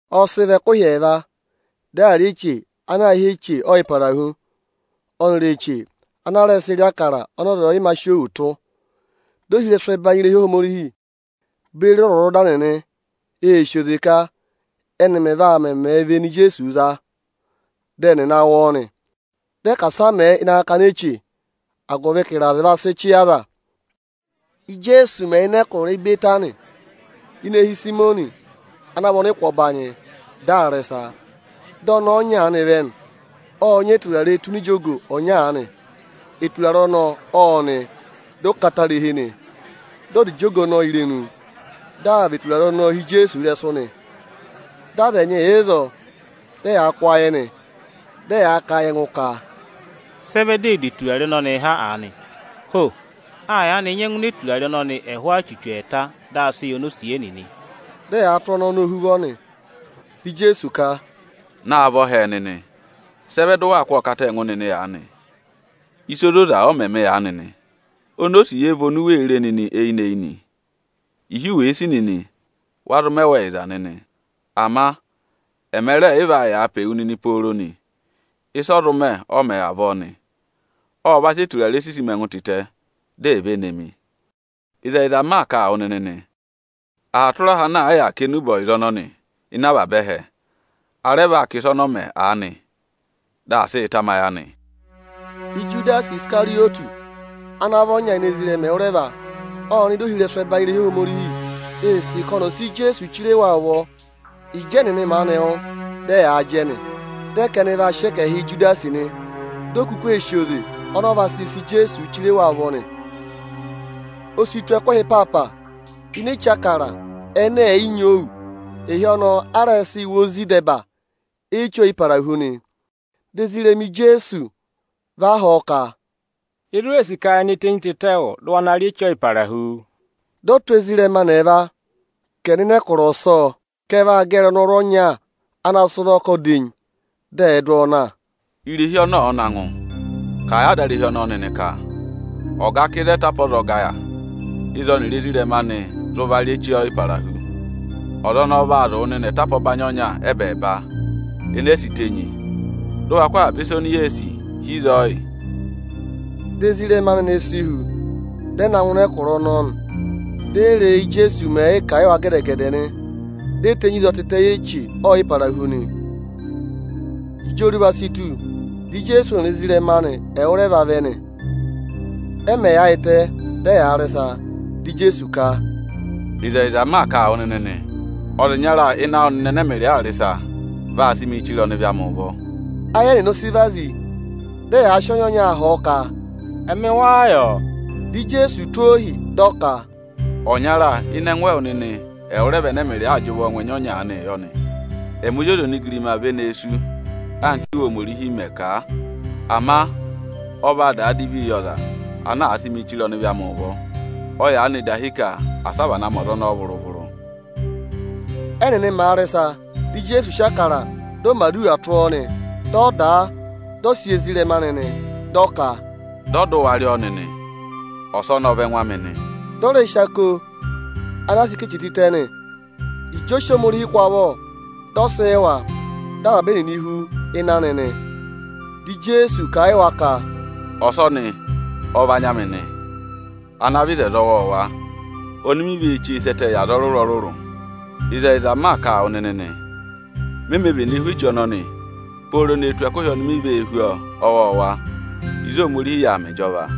Ọ sị vọ ẹkụhị ẹẹva, dị à rị eche ana aā hị́ Eche Ọyịparahu, ọnịrị eche ana a rẹ sịị̄ rị Ịbụrẹẹdị ọnị ọza ọ̀ yị mā sị òwù tụ́. Dị ohirẹsụ ẹbanyị irehi Ohomorihi beri ọzwọzọda nịnị ee sì oze ka ẹ́nị mẹ̀ vaa mẹ vene Ijeesuu za, dị ẹnị ẹ̀ na wụ ọọ nị. Dị ẹ ka asị a mẹẹ ịnị akakana eche, agụvị ka ịrazị va sị chị yị aza nị. Íjeesu mẹ̀ yà ịnị ẹkụra Ịbẹtanị, ini eehi Ịsayịmọnị ana vị ọnịkụ ọbanyị, dị aa rị ịsa, dị ọnẹẹ ọnya aanị vẹ nị. Ộ nyị eturare tụ́ ini ijogo ọnya aanị. Eturare ọnọọ ộ nị, dị ọ katarihi nị. Dị ọ dà ijogo ọnọọ irenu, dị aa và eturare ọnọọ hi Ijeesu ịrẹsụ nị. Dị aza ẹnyị yà ịzọọ, dị ẹyaa kụ́ ayị nị. Dị ẹyaa kà a yị ẹngụ ka, “Sị ẹ vẹ di ee du eturare ọnọnịị ha aanị? Ho! A yaanị nyẹngụ ná eturare ọnọnị ẹhụụ achuchu ẹẹta, dị a sị yị onosiye nịnị.” Dị ẹyaa tụ́ ọnẹẹ ọnọọ ohuvọ nị. Dị Ijeesu ka, “Naavọ hẹẹ nịnị! Sị ẹ vẹ dị ụ waa kụ́ ọọ kata a ẹngụ nịnị aanị? Ịsa ozoza ọ mẹ mị aanị nị. Onosiye vị oni u wee re nịnị eyinị-eyinị; ịhị wèe sì nịnị, wa zụ mẹ wa ẹyịza nịnị. Ama ẹma rẹẹ̀ yị vaa yàa pe wu nịnị pooro nị. Ịsị ọ zụ mẹ, ọ mẹ avọọ nị. Ộ va sị eturare sisi mi ẹngụ tịtẹ, di è ve ne mi. Ịzẹyịza m maa kà a wụ nịnị nị, aha tụra aha ana àa yà aa kà enube ọyịza ọnọnị ịnị avaba ẹhẹ, a rẹ vaa kà ịsa ọnọọ mẹ aanị nị, dị aa sịị tamayị anị.” Ijudasi Isikarịyọtị ana vị ọnya ini ezirẹma ẹwụrẹva, ộ nọ ịdị ohirẹsụ ẹbanyị irehi Ohomorihi. Ee sì ka ọnị ọ̀ sị Ijeesu chire wa ụvọ. Ịjị ẹnịnị maanị wụ́, dị ẹyaa jẹ nị, dị ẹ ka ẹnị vaa sị ẹkẹhịị yị Ijudasi nị. Di o kuku ee sì oze ọnị ọ vaa zịị sị Ijeesuu chire wa ụvọ nị. O si tù ẹkụhị ịpaapa ini Eche Ịbụrẹẹdị ẹnẹ ẹ̀ yị nyị òwù. Ịhị ọnọọ a rẹ sịị̄ wụ ozi ịdẹba Eche Ọyịparahu nị. Dị ezirẹma Ijeesu va họ̀ ọ ka, “Ịzị u wee sì ka ye ne tenyi tịtẹ yị wụ, dị ụ wa na yà rị Eche Ọyịparahu?” Dị ọ tụ́ ezirẹma anị ẹẹva ụtụ dị ọ kà, “Nọ ịnị ẹkụra ọsọọ, ka ụ vaa gẹrị ọnọrụ ọnya ana sị ụnọkọ dà enyi, dụ ọọ na. Irehi ọnị ọ̀ọ na ngụ, kà a yị adarehi ọnọọ nịnị ka: ‘Ọga kà: Ịzị aha oyichi ọzọga yà, ịzị ọnịrị ezirẹma anị vaa rị ịsọyịrị Eche Ọyịparahu?’ Ọza ọnọọ vaa zụ̀ wụ nịnị atapa ọbanyị ọnya ẹ́bẹẹba, enee si tenyi, dị ụ wa kụ avaba ịsa oni yee sì hi ịzọọ yị nịnị.” Dị ezirẹma anị ẹnẹẹ si hu, dị ẹ na ngụ ịnị ẹkụra ọnọọ nị. Ẹnịnị ee re e íjeesu mẹ̀ yị kà a yị wa gẹdẹ-gẹdẹ. Di e tenyi ịzọọ tịtẹ yị Eche Ọyịparahu nị. Ịjị oruva si tù, dị Ijeesu ọnịrị ezirẹma anị ẹwụrẹva vẹ nị. Ẹ mẹ̀ yaayịtẹ, dị ẹyaa rị ịsa, dị Ijeesu ka, “Ịzẹyịza m maa kà a wụ nịnị nị, ọza ịnyara ịnị awụ nịnị ẹnẹ ẹmịrịị aa rị ịsa, vaa sị mịị chire ọnịvị amị ụvọ.” Ayị ẹnịnị ọ sị vazi, dị ẹyaa sị ọnya-ọnya họ̀ ọ ka, “Ẹmị wáá yọ?” Dị Ijeesu tụ́ ohi, dị ọ ka, “Ọnyara ịnị ẹngụ ẹwụ nịnị ẹwụrẹva ẹnẹ ẹmịrịị aa jị ụvọọ ngụ ẹnya ọnya aanịị yọ nị. Ẹmị Ozi ọza onigirima ve nee sú anka Íwe Ohomorihi mẹ̀ kà a. Ama ọ vaa daa divi yị ọza ana àa sị mị chire ọnịvị amị ụvọ; ọ yaanị dahi ka asị a vana ma ọza ọnọọ vụrụ-vụrụ.” Ẹ́nịnị màa rị ịsa, dị Ijeesu sị Ịbụrẹẹdị, dị ọ mẹ̀ aduwa tụ́ ọọ nị. Ộ dà a, dị ọ sị yị ezirẹma anị nị. Dị ọ ka, “Dọ, dị ụ wa rị ọọ nịnị, ọsọnị ọ vị ẹngụ amị nị.” Dị ọ rẹ sị ako anaa sị ká eche tịtẹ nị; ịjị ọ sị Ohomorihi kụ́ avọ, dị ọ sị yị wa, dị avaba ẹnịnị hú ịnị anị nị. Dị Ijeesu kà a yị wa ka, “Ọsọnị ọ vị anya amị nị, ana vị oto ọwọọwa, oni mi vee chee sẹ́ ẹtẹ yị aza ọrụrụ-ọrụrụ. Ịzẹyịza m maa kà a wụ nịnị nị, me mē vene hú eche ọnọnị pooro ne tù ẹkụhị oni mi vee hú ọọ ọwọọwa ịzị Ohomorihi yà aa mẹ ịjọva.”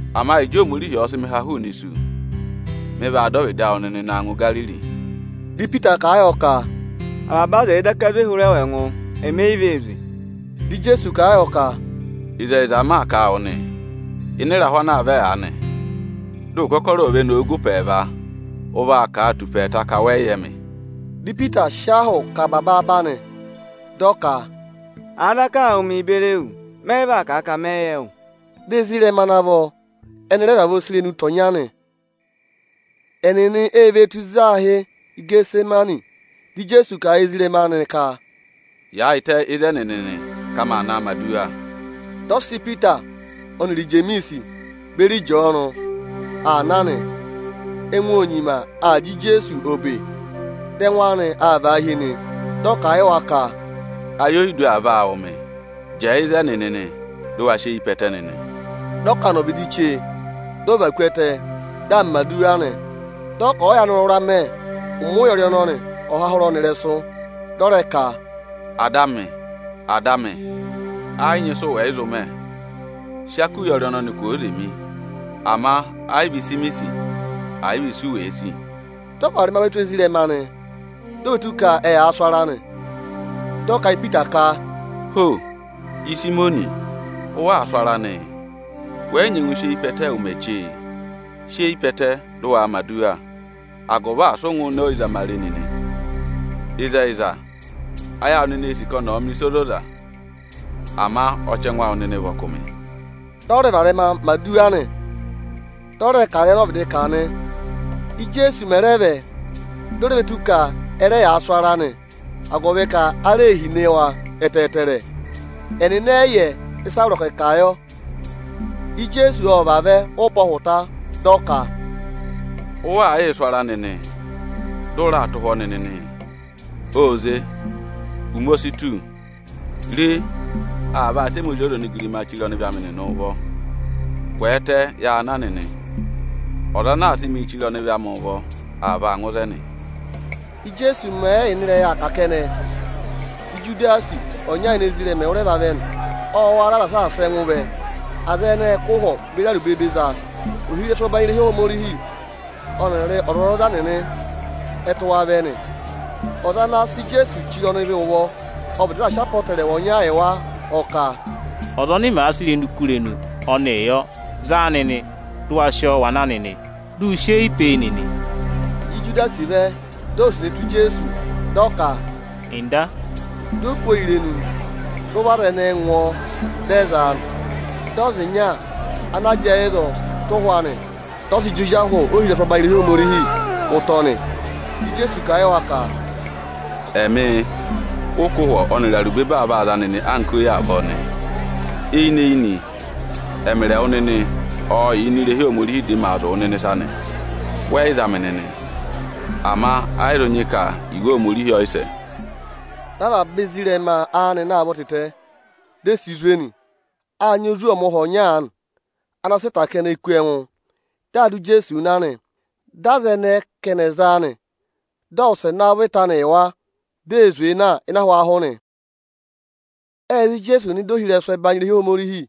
Ama Ịjị Ohomorihi ọ̀ọ sị mị ha hụụnị isu, mị vaa dọ ọvịdị awụ nịnị na ngụ Igariri.” Dị Ipita kà a yọ ka, “Avaba aza ẹ̀ẹ daka zwe hụrẹ wụ ẹngụ, emi e yi vee zwe!” Dị Ijeesu kà a yọ ka, “Ịzẹyịza m maa kà a wụ nị, ịnị ịrahụ ana aa vẹ aanị, dị ụkọrọ ò ve nowu gụ ụpẹ ẹẹva, ụ vaa kà a tù ụpẹ ẹẹta ka wẹ yị yẹ mị.” Dị Ipita sị ahụ kà aba baaba nị, dị ọ ka, “Àa daka aa wụ mịị beri ewu, mẹ yị vaa kà a ka mẹ yị yẹ wụ.” Dị ezirẹma ana vọ ẹnị rẹ vavọọ sị irenu tọ̀ ọnya nị. Ẹnịnị e ve tù ịzị aā hị́ Ịgẹtịsẹmanị. Dị Ijeesu kà a yị ezirẹma anị ka, “Yaayịtẹ ịzẹnị nịnị, ka maa naa mẹ̀ aduwa!” Dị ọ sị Ipita ọnịrị Ijemiisi beri Ịjọọnụ aa na nị. Ẹngụ ô nyima aa jị Ijeesu obe, dị ẹngụ anị aa vaa hi nị. Dị ọ kà a yị wa ka, “Ayị oyidu aa vaa wụ̀ mị. Jẹẹ ịzẹnị nịnị, dị ụ wa sị eyi pe ẹtẹ nịnị!” Dị ọ kà nọ ọvịdị chee, dị ọ và ku ẹtẹ, dị aa mẹ̀ aduwa nị. Dị ọ ka ọ̀ọ yaanị wụra mẹ, ụmẹ ụyọrị ọnọnị ọ̀ ha hụrẹ ọnị ịrẹsụ. Dị ọ rẹ ka, “Ada amị, ada amị, ẹ yị nyị ịsụ wẹ̀ yị zụ mẹ. Sị ako ụyọrị ọnọnị kwooze mi! Ama ẹ yị vị ịsị mi sì, ẹ̀ yị vị isu wèe sì.” Dị ọ varẹma ve tù ezirẹma anị, di o ve tù ka ẹyaa sụ ara nị. Dị ọ kà a yị Ipita ka, “Ho! Ịsayịmọnị, ụ waa sụ ara nịị? Wẹ yị nyẹngụ sị eyi pe ẹtẹ ụmẹ cheee? Sị eyi pe ẹtẹ, dị ụ waa mẹ̀ aduwa, agụvị asị ụ ngụ ịnị ọyịzamare nịnị. Ịzẹyịza, ayị awụ nịnị ee sì ka ọnị ọ̀ mẹ̀ ịsa ozoza, ama ọchẹngụ awụ nịnị vị ọkụmị.” Dị ọ rẹ varẹma na mẹ̀ aduwa, dị ọ rẹ kà ịrẹyị ọnị ọ vịdị kà nị. Íjeesu mẹ̀ rẹ vẹ, di o re ve tù ka ẹ rẹ yaa sụ ara nị, agụvị ka ara ee hine wa ẹtẹẹtẹrẹ. Ẹnịnị ẹ yị yẹ ịsị a vọrọ ka ẹ̀ kà yọ. Ijeesu ộ vavẹ ụpẹ ọhụta, dị ọ ka, “Ụ waa yịị sụ ara nịnị, dị ụ raa tụ́ ụhwọ́ nịnị nịị? Ô ze! Ụmẹ o si tù; re, aa vaa sị ẹmị Ozi ọza onigirimaa chire ọnịvị amị nịnị ụvọ. Kwẹẹtẹ, ya na nịnị! Ọza ana aa sị mịị chire ọnịvị amị ụvọ, aa vaa ngụ ịzẹnị.” Íjeesu mẹ̀ yị yà ịnị ịrẹyị aa kà kẹnẹ, dị Ijudasi, ọnya ini ezirẹma ẹwụrẹva vẹ nị. Ộ wara aza saasa ẹngụ vẹ; aza ẹnẹẹ ệ kụ́ ụhwọ beri arubebe za. Ohirẹsụ ẹbanyị irehi Ohomorihi ọnịrị ọzwọzọda nịnị ẹ tụ́ wa vẹ nị. Ọza ana aa naa sị Ijeesu chire ọnịvị ụvọ, ộ vịdị raà sị apọtẹrẹwa ọnya yị wa, ọ ka, “Ọza ọnị mèe kú irenu, ọnịị yọ nị, za a nịnị, dị ụ wa sị ọọ wa na nịnị! Dị ụ sị eyi pe e nịnị!” Ịjị Ijudasi vẹ, dị ọ wụsẹ ne tù Ijeesu, dị ọ ka: Nda, di o kú ọọ irenu nị. Dị ụvọ aza ẹnẹẹ ngụ ọọ, dị ẹ za a nị. Dị ọza ọnya ana jẹẹ ịzọọ, tụ̀ ụhwọ anị, dị ọ sị jị ozi ahụ ohirẹsụ ọbanyị irehi Ohomorihi ụtọ nị. Dị Ijeesu kà a yị wa ka, “Ẹmị ụ kụ́ ụhwọ ọnịrị arubebe aa vaa za nịnị anka oyi avọọ nịnị? Eyinị-eyinị ẹmịrị ẹwụ nịnị ộ yà ini irehi Ohomorihi, dị maa zụ̀ wụ nịnị ịsa nị, wẹ yị za mị nịnị. Ama ẹ yị zụ nyị ka Iwe Ohomorihi ọ yị sẹ.” Dị avaba ezirẹma anị na a vọ tịtẹ, di e si zwe nị. Â nyị ozwọọmụha ọnya aanị ana sị ịta kẹnẹ kú ẹngụ, dị aa dụ Ijeesuu na nị. Dị aza ẹnẹẹ ka ẹnị ẹ̀ za a nị. Ộ wụsẹ navọ ịta anị yị wa, di ee zwee na ịnị ahwaahụ nị. Ệ za Ijeesu nọ ịdị ohirẹsụ ọbanyị irehi Ohomorihi.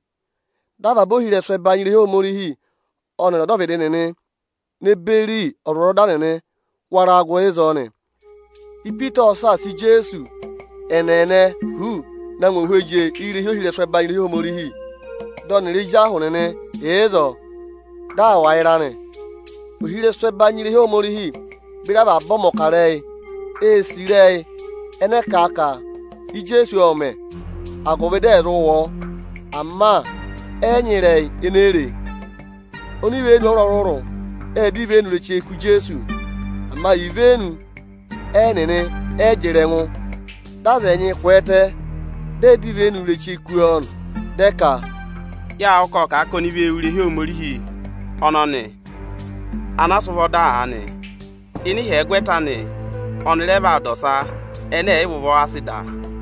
Dị avaba ohirẹsụ ẹbanyị irehi Ohomorihi ọnịrị ọdọvịdị nịnị ne beri ọzwọzọda nịnị wara gụ ịzọọ nị. Ipita ộ saasa Ijeesu ẹ́nẹẹnẹ huuu na ngụ ini ohweje irehi ohirẹsụ ọbanyị irehi Ohomorihi. Dị ọnịrị ezi ahụ nịnị yà ịzọọ, dị aa wà ịra nị. Ohirẹsụ ẹbanyị irehi Ohomorihi beri avaba ọmọkarẹyị ee sì ịrẹyị ẹnẹ ẹ vaa kà a ka Ijeesu ộ mẹ̀, agụvị dị ẹ̀ zụ wụ ọọ. Ama ẹ yị nyị ịrẹyị ene e re. Onivenu ọrụrụ-ọrụrụ ê dọ ivenu ireche kú Ijeesu. Ama ivenu ẹnịnị ẹ yị jịrị ẹngụ. Dị aza ẹnyị kwẹẹtẹ, dị ẹ dọ ivenu ireche kú ọọ nị, dị ẹ ka, “Yâ wụ́ ka ộ kà a ka oni vee wú irehi Ohomorihi ọnọnị ana a sị ụvọ dà aanị; ịnị ịhyẹgwẹta anị ọnị rẹ vaa dà ọsa ẹnẹ ẹ̀ yị vị ụvọ a sị dà a.”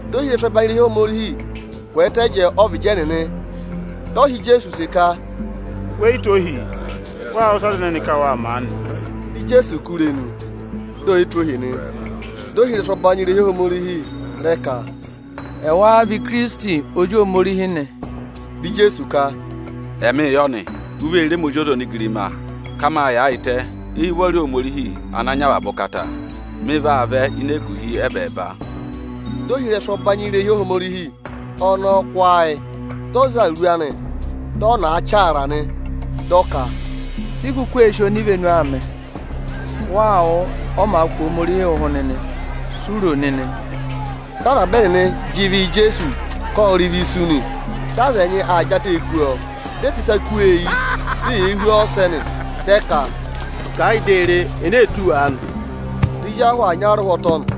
Di ohirẹsụ ọbanyị irehi Ohomorihi kwẹẹtẹ jẹẹ ọ́vịdị ẹnịnị, dị ọ họ̀ Ijeesu use ka, “We yi tụ́ ohii? Waa wụ́ ịsị aza ẹnẹnị ka waa mẹ aanị?” Dị Ijeesu kú irenu, di ò yi tụ́ ohi nị. Dị ohirẹsụ ọbanyị irehi Ohomorihi rẹ ka, “Ẹ wáá vị Ikirisiti, Ozi Ohomorihi nị?” Dị Ijeesu ka, “Ẹ mịị yọ nị. U vee re ẹmị Ozi ọza onigirima ka mâ yaayịtẹ eyi ụvọrị Ohomorihi Ochẹtẹngụ. Mị vaa vẹ ịnị eguhi ẹ́bẹẹba.” Dị ohirẹsụ ọbanyị irehi Ohomorihi ọnọọ kụ́ ayị, dị ọ za awuru anị, dị ọ na a chaara nị. Dị ọ ka, “Si i kuku ee sì onivenu aa mẹ? Wáá wụ́, ọ màa kụ̀ Ohomorihi ụhụ nịnị? Si u ro nịnị?” Dị avaba ẹnịnị jị ịvị yị Ijeesu, ka ộ rị ịvị isu nị; Dị aza ẹnyị aa jị atẹẹ kú ọọ, dị ẹ sị ịsa kú ọọ eyi, di eyee hú ọ ọsẹ nị. Dị ẹ ka, “Kà ẹ yị di a re, ene ee tụ́ wu aanị!” Dị ezi ahụ aa nya a arụhwọtọ nị.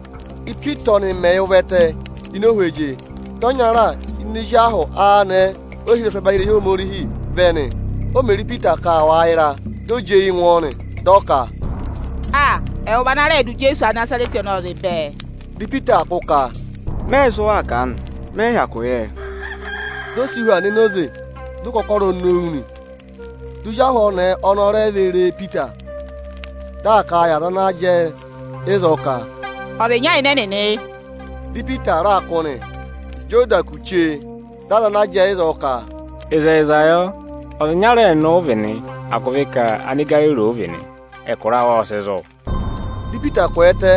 Ípita ọnị mẹ̀ yà ụvẹtẹ ini ohweje, dị ọnyara ini ezi ahụ anẹẹ ohirẹsụ ọbanyị irehi Ohomorihi vẹ nị. O mè re Ipita ka aa wà ịra, di o jị eyi ngwọ ọ nị, dị ọ ka, “Aa! Ẹwụ vị ana rẹẹ̄ dụ Ijeesu Anịnazarẹtị ọnọọ zị bẹẹ!” Dị Ipita aa kụ́ ka, “Mẹ yị yẹ ịsị waa kà aanị; mẹ yị hyakụ yẹ.” Di o si hu aa nọ enoze, dị ụkọkọrọ nowu nị. Dị ozi ahụ ọnẹẹ ọnọọ re ve re Ipita, dị aa kà a yị aza ana jẹẹ ịzọọ ka, “Ọza ịnya ịnị ẹnịnị yị.” Dị Ipita raa kụ́ nị. Ịjị ọ da kù chee, dị aza ana jẹẹ ịzọọ ka, “Ịzẹyịza yọ, ọza ịnyara ẹnịnị ụ vị nị, agụvị ka Anigariri ụ vị nị, ẹkụra awụ ộ sị zụ̀.” Dị Ipita kwẹẹtẹ,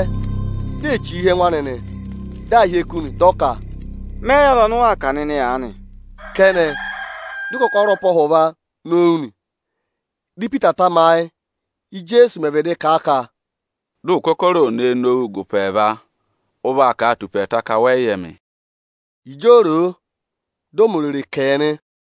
di ee chì hi ẹngụ anị nị, dị aa hyeku nị, dị ọ ka, “Mẹ yị yẹ ọza ọnị ụ waa kà nịnị aanị.” Kẹnẹ, dị ụkọkọrọ ụpẹ ọhụva nowu nị. Dị Ipita tamayị, Íjeesu mẹ̀ vịdị kà a ka, “Dị ụkọkọrọ ò nee nowu gụ ụpẹ ẹẹva, ụ vaa kà a tù ụpẹ ẹẹta, ka wẹ yị yẹ mị.” Ịjị o ro o, dị ọ mẹ orere kẹ nị.